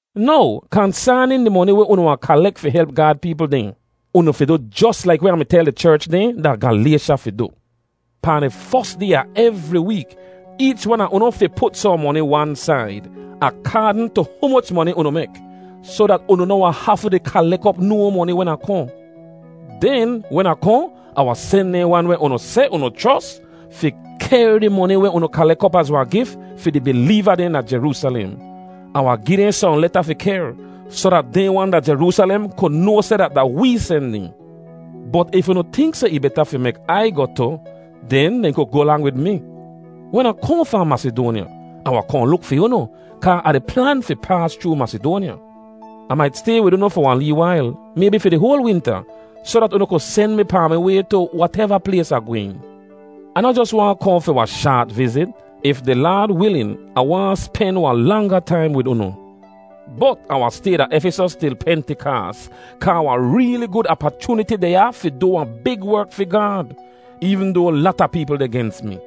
Now, kansaanin di moni weh unu wahn kalek fi help Gaad peepl dehn: Unu fi du jos laik weh Ah mi tel di cherch dehn da Galaysha fi du. Pahn di fos day a evri week, eech wan a unu fi put sohn moni wan said, akaadn tu humoch moni unu mek, soh dat unu noh wahn hafu di kalek op no moni wen Ah kohn. Den, wen Ah kohn, Ah wahn sen dehn wan weh unu seh unu chros fi kehr di moni weh unu kalek op az wahn gif fi di bileeva dehn da Jeroosalem. Ah wahn gi dehn sohn leta fi kehr, soh dat dehn wan da Jeroosalem ku noa seh dat da wee sen dehn. Bot if unu tink seh ih beta fi mek Ai goh tu, den dehn ku goh lang wid mi. Wen Ah kohn fahn Masidoanya, Ah wahn kohn luk fi unu, kaa Ah di plan fi paas chroo Masidoanya. Ah mait stay wid unu fi wahn lee wail, maybi fi di hoal winta, soh dat unu ku sen mi pahn mi way tu wateva plays Ah gwehn. Ah noh jos waahn kohn fi wahn shaat vizit; if di Laad wilin Ah waahn spen wahn langa taim wid unu. Bot Ah wahn stay da Efisos til Pentikaas, kaa wahn reeli gud apachooniti deh ya fi du wahn big werk fi Gaad, eevn doa lata peepl deh gens mi.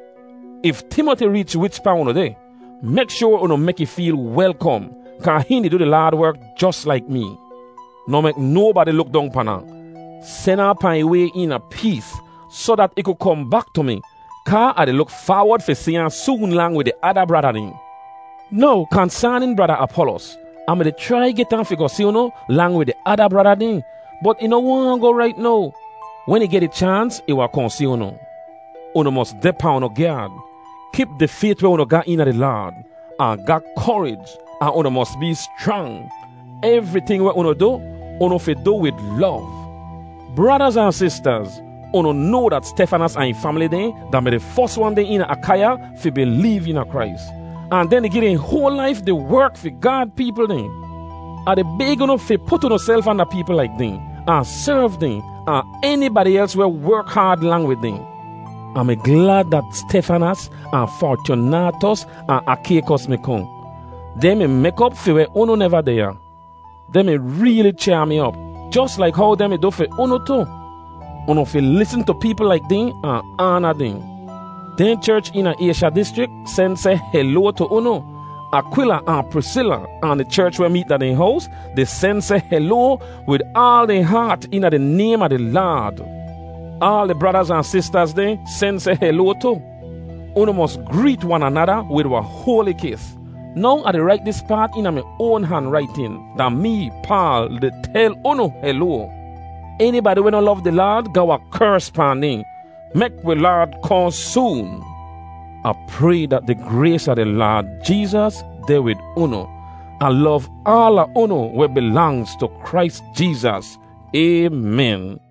If Timoti reech wichpaa unu deh, mek shoar unu mek ih feel welkom, kaa hihn di du di Laad werk jos laik mee. Noh mek nobadi luk dong pan ahn. Sen ahn pahn ih way eena pees, soh dat ih ku kohn bak tu mi, kaa Ah di luk faawod fi si ahn soon lang wid di ada brada dehn. Now kansaanin Brada Apolos: Ah mi-di chrai get ahn fi goh si unu lang wid di ada brada dehn bot ih noh waahn goh rait now. Wen ih geh di chaans, ih wahn kohn si unu. Unu mos deh pahn unu gyaad. Kip di fayt weh unu ga eena di Laad, ahn ga korij, ahn unu mos bee schrang. Evriting weh unu du, unu fi du wid lov. Bradaz ahn sistaz, unu noa dat Stefanas ahn ih famili dehn da-mi di fos wan dehn eena Akaiya fi bileev eena Krais. Ahn dehn di gi dehn hoal laif di werk fi Gaad peepl dehn. Ah di bayg unu fi put unuself anda peepl laik dehn, ahn serv dehn, ahn enibadi els weh werk haad lang wid dehn. Ah mi glad dat Stefanas, ahn Fortyunaatos, ahn Akaykos mi kohn. Dehn mi mek op fi weh unu neva deh ya. Dehn mi reeli chyaa mi op, jos laik how dehn mi du fi unu tu. Unu fi lisn tu peepl laik dehn ahn aana dehn. Dehn cherch eena Aysha dischrik sen seh heloa tu unu. Akwila ahn Prisila, ahn di cherch weh meet da dehn hows, di sen seh heloa wid aal dehn haat eena di naym a di Laad. Aal di bradaz ahn sistaz dehn sen seh heloa tu. Unu mos greet wan anada wid wahn hoali kis. Now Ah di rait dis paat eena mi oan hanraitin: Da mee, Paal, di tel unu heloa. Enibadi weh noh lov di Laad ga wahn kers pahn dehn. Mek wi Laad kohn soon! Ah pray dat di grays a di Laad Jeezas deh wid unu. Ah lov aala unu weh bilangz tu Krais Jeezas. Aymen.